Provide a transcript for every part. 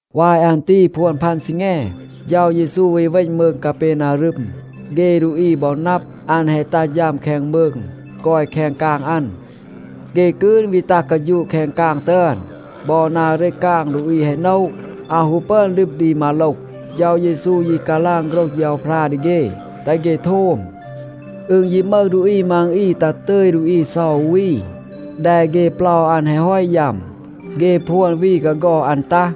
วาย อัน ตี พวน พัน ซีแง, เฌา เยซู วี เวณ มืง กาเปนารึม. เฆ ดูอี บอ นับ, อัน แฮะ ตัห ฌัม แคง มืง, กอย แคง กาง อัน. เฆ กืน วี ตัห กาฌูะ แคง กาง ตึอน. บอ นา เรต กาง ดูอี แฮะ โนะ. อาว ฮู ปึอน ลึบ ดี มาโลห. เฌา เยซู ยี กาลาง โฆรห เฌาพรา ดี เฆ, แตห เฆ โทม. อึณ ยี มึห ดูอี มัง อี ตัห ตึย ดูอี เซา อู วี. แด เฆ เปลา อัน แฮะ ฮอต ยัม. เฆ พวน วี กาฆอด อัน ตัห.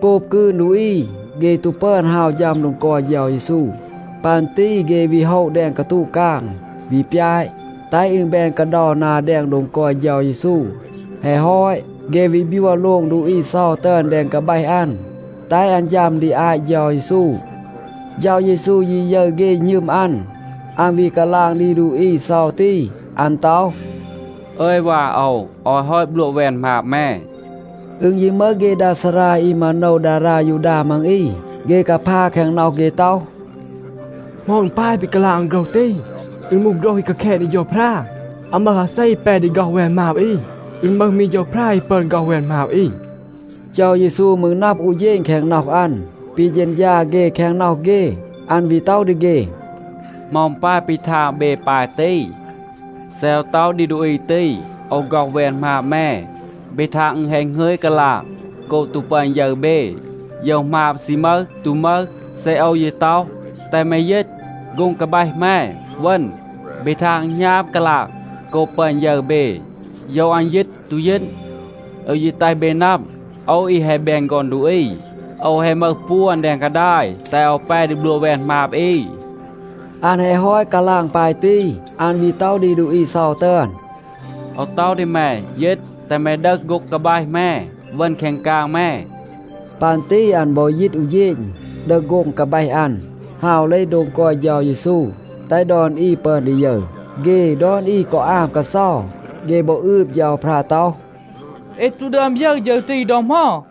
โกบ กืน ดูอี, เฆ ตู ปึอน ฮาว ฌัม โดง กอย เฌา เยซู. ปัน ตี เฆ วี โฮะ แดง กาตูะ กาง, วี ปยาต, แตห อึณ แบน กาเดา นา แดง โดง กอย เฌา เยซู.a แฮะ ฮอต, เฆ วี บยัว โลง ดูอี เซา ตึอน แดง กาแบห อัน, แตห อัน ฌัม ดี อาต เฌา เยซู. เฌา เยซู ยี ยึร เฆ หณึม อัน, อัน วี กาลาง ดี ดูอี เซา ตี. อัน ต็อห, “อึย วา โอว, โอว แฮะ ฮอต บลัวะ แวน หมาบ แม.” อึณ ยี มึห เฆ ดา ซารา อี มาโนว ดารา ยูดา มัง อี, เฆ กาพา แคง น็อห เฆ ต็อห, “เหมา อึณ ปาย ปี กาลาง อัน โฆรห ตี? อึณ มูห โฆรห อี กาแคณ ดี เฌาพรา. อาว มึห อาเซ แป ดี ฆ็อห แวน หมาบ อี. อึณ มึห มี เฌาพรา อี ปึอน ฆ็อห แวน หมาบ อี.” เฌา เยซู มืร นับ อู เฌณ แคง น็อห อัน ปี เฌณฌา เฆ แคง น็อห เฆ. อัน วี ต็อห ดี เฆ, “เหมา อึณ ปาย ปี ทาง เบ ปาย ตี? เซ โอว ต็อห ดี ดูอี ตี, ‘โอว ฆ็อห แวน หมาบ แม,’ เบ ทาง อึณ แฮะ หงึย กาลาง โกบ ตู ปึอน ยึร เบ, โยว หมาบ ซี มึห, ตู มึห. เซ โอว ยี ต็อห, ‘แตห แม ยีต, โฆ็ง กาแบห แม, เวณ,’ เบ ทาง อึณ หณาบ กาลาง โกบ ปึอน ยึร เบ, โยว อัน ยีต, ตู ยีต. โอว ยี แตห เบ นับ, โอว อี แฮะ แบน ฆอน ดูอี, โอว แฮะ มึห ปวน แดง กาดาย, แตห โอว แป ดี บลัวะ แวน หมาบ อี.” อัน แฮะ ฮอต กาลาง ปาย ตี, อัน วี ต็อห ดี ดูอี เซา ตึอน, “โอว ต็อห ดี แม, ยีต, แตห แม ดึห โฆ็ง กาแบห แม, เวณ แคง กาง แม.” ปัน ตี อัน บอ ยีต อู เฌณ, ดึห โฆ็ง กาแบห อัน, ฮาว เลห โดง กอย เฌา เยซู, แตห ดอน อี ปึอน ดี ยึร. เฆ ดอน อี กอ อาม กาเซา. เฆ บอ อืบ เฌาพรา ต็อห, “เอ ตู ดึอม ยึร ฌึร ตี ดอ เหมา.”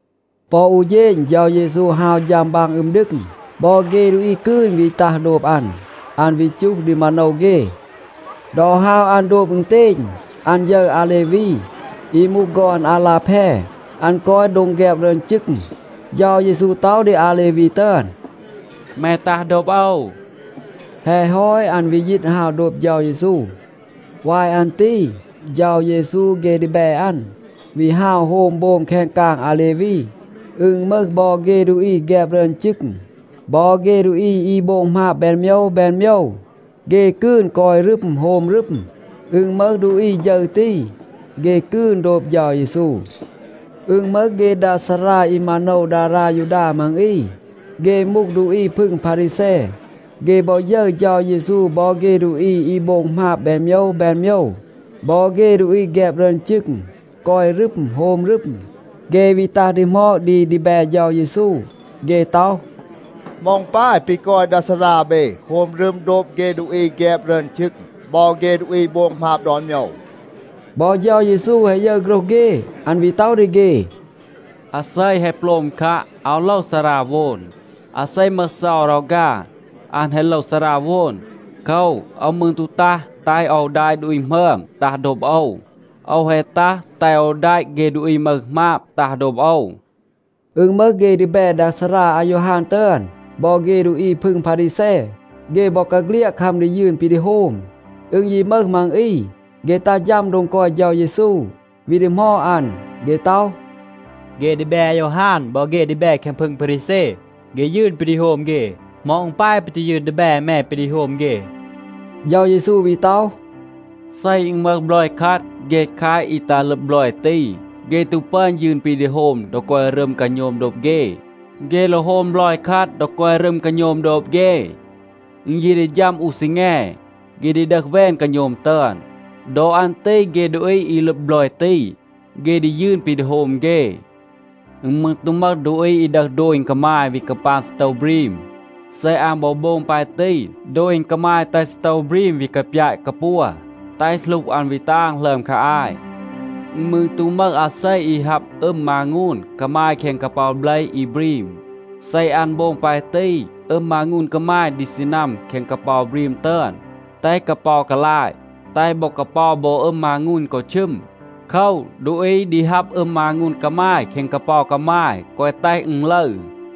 ปอ อู เฌณ เฌา เยซู ฮาว ฌัม บาง อึม ดึง. บอ เฆ ดูอี กืน วี ตัห โดบ อัน. อัน วี จูห ดี มาโนว เฆ. ดอ ฮาว อัน โดบ อึณเตณ, อัน ยึร อาเลวี, อี มูห ฆอน อาลาแพ. อัน กอย โดง แฆบ รึอน จึง. เฌา เยซู ต็อห ดี อาเลวี ตึอน, “แม ตัห โดบ โอว.” แฮะ ฮอต อัน วี ยีต, ฮาว โดบ เฌา เยซู. วาย อัน ตี เฌา เยซู เฆ ดีแบ อัน วี ฮาว โฮม โบม แคง กาง อาเลวี. อึณ มึห บอ เฆ ดูอี แฆบ รึอน จึง บอ เฆ ดูอี อี โบง หมาบ แบน โมยว แบน โมยว, เฆ กืน กอย รึม, โฮม รึม. อึณ มึห ดูอี ฌึร ตี, เฆ กืน โดบ เฌา เยซู. อึณ มึห เฆ ดา ซารา อี มาโนว ดารา ยูดา มัง อี. เฆ มูห ดูอี พึง พารีแซ, เฆ บอ ยึร เฌา เยซู บอ เฆ ดูอี อี โบง หมาบ แบน โมยว แบน โมยว บอ เฆ ดูอี แฆบ รึอน จึง,b กอย รึม, โฮม รึม. เฆ วี ตัห ดีหมอด ดี ดีแบ เฌา เยซู. เฆ ต็อห, “เหมา อึณ ปาย ปี กอย ดา ซารา เบ, โฮม รึม โดบ เฆ ดูอี อี แฆบ รึอน จึง บอ เฆ ดูอี อี โบง หมาบ ดอน โมยว?” บอ เฌา เยซู แฮะ ยึร โฆรห เฆ. อัน วี ต็อห ดี เฆ, “อาเซ แฮะ โปลม คัะ, อาว โลว ซาราโวน. อาเซ มึห เซา รอฆา, อัน แฮะ โลว ซาราโวน. โคว, โอว มืร ตู ตัห แตห โอว แดะ ดูอี หมึอม ตัห โดบ โอว. โอว แฮะ ตัห แตห โอว แดะ เฆ ดูอี มึห หมาบ ตัห โดบ โอว.” อึณ มึห เฆ ดีแบ ดา ซารา อายอฮาน ตึอน, บอ เฆ ดูอี พึง พารีแซ, เฆ บอกาเฆลียด คัม ดี ยืน ปี ดี โฮม. อึณ ยี มึห มัง อี, เฆ ตัห ฌัม โดง กอย เฌา เยซู, วี ดีหมอด อัน. เฆ ต็อห, “เฆ ดีแบ อายอฮาน บอ เฆ ดีแบ แคง พึง พารีแซ, เฆ ยืน ปี ดี โฮม เฆ. เหมา อึณ ปาย ปี ตู ยืน ดีแบ แม ปี ดี โฮม เฆ?”c เฌา เยซู วี ต็อห, “เซ อึณ มึห บลอย คัด, เฆ แคต อี ตัห ลึบ บลอย ตี, เฆ ตู ปึอน ยืน ปี ดี โฮม ดอ กอย รึม กาโณม โดบ เฆ. เฆ โลว โฮม บลอย คัด, ดอ กอย รึม กาโณม โดบ เฆ. อึณ ยี ดี ฌัม อู ซีแง, เฆ ดี ดึห แวน กาโณม ตึอน. ดอ อัน ตี เฆ ดูอี อี ลึบ บลอย ตี, เฆ ดี ยืน ปี ดี โฮม เฆ. อึณ มืร ตู มึห ดูอี, อี ดึห โดณ กามาย วี กาปาง ซีโตว บรีม. เซ อัน บอ โบง ปาย ตี, โดณ กามาย แตห ซีโตว บรีม วี กาปยาต กาปัว, แตห หลูห อัน วี ตาง หลึอม คา อาต. อึณ มืร ตู มึห อาเซ อี ฮับ อึม มางูน กามาย แคง กาเปา เบล อี บรีม. เซ อัน โบง ปาย ตี, อึม มางูน กามาย ดี ซีนัม แคง กาเปา บรีม ตึอน, แตห กาเปา กาลาต, แตห บอ กาเปา บอ อึม มางูน กอ ชึม. โคว, ดูอี ดี ฮับ อึม มางูน กามาย แคง กาเปา กามาย, แกวะ แตห อึณ ลึร.”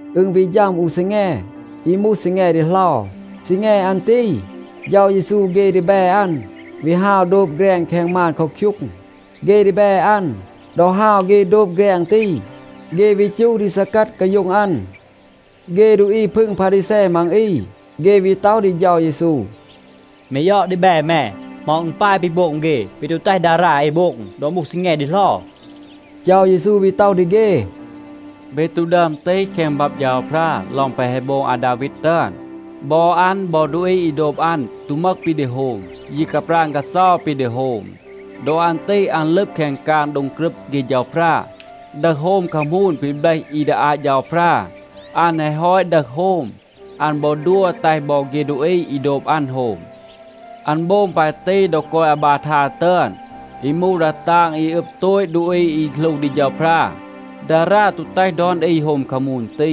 อึณ วี ฌัม อู ซีแง อี มูห ซีแง ดีเหลา. ซีแง อัน ตี, เฌา เยซู เฆ ดีแบ อัน วี ฮาว โดบ แฆรง แคง มาน เคาคยูง. เฆ ดีแบ อัน, ดอ ฮาว เฆ โดบ แฆรง ตี, เฆ วี จูห ดี ซีกัด กาโย็ง อัน. เฆ ดูอี พึง พารีแซ มัง อี, เฆ วี ต็อห ดี เฌา เยซู, “แม ยอด ดีแบ แม, เหมา อึณ ปาย ปี โบง เฆ ปี ตู แตห ดารา เอ โบง ดอ มูห ซีแง ดีเหลา?” เฌา เยซู วี ต็อห ดี เฆ, “เบ ตู ดึอม ตีห แคง บับ เฌาพรา ลอง แปะ แฮะ โบง อาดาวีด ตึอน? บอ อัน บอ ดูอี อี โดบ อัน ตู มึห ปี ดี โฮม, ยี กาปราณ กาเซา ปี ดี โฮม. ดอ อัน ตี อัน ลึบ แคง กาง โดง กรึบ เฆ เฌาพรา, ดึห โฮม คามูน ปี เบลห อี ดี อาต เฌาพรา. อัน แฮะ ฮอต ดึห โฮม, อัน บอ ดัว แตห บอ เฆ ดูอี อี โดบ อัน โฮม. อัน โบง ปาย ตี, ดอ กอย อาบาทา ตึอน, อี มูห ดา ตาง อี อึบ โตต ดูอี อี หลู ดี เฌาพรา. ดารา ตู แตห ดอน อี โฮม คามูน ตี.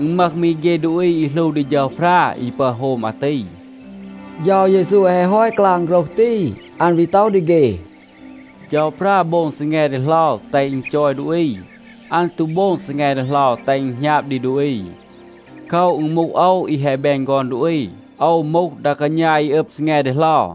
อึณ มึห มี เฆ ดูอี อี หลู ดี เฌาพรา, อี ปึอน โฮม อาตี.” เฌา เยซู แฮะ ฮอต กาลาง โฆรห ตี, อัน วี ต็อห ดี เฆ, “เฌาพรา โบง ซีแง ดีเหลา, แตห อึณ จอย ดูอี. อัน ตู โบง ซีแง ดีเหลา แตห อึณ หณาบ ดี ดูอี. โคว, อึณ มูห โอว, อี แฮะ แบน ฆอน ดูอี, โอว มูห ดา กาณา อี อึบ ซีแง ดีเหลา.”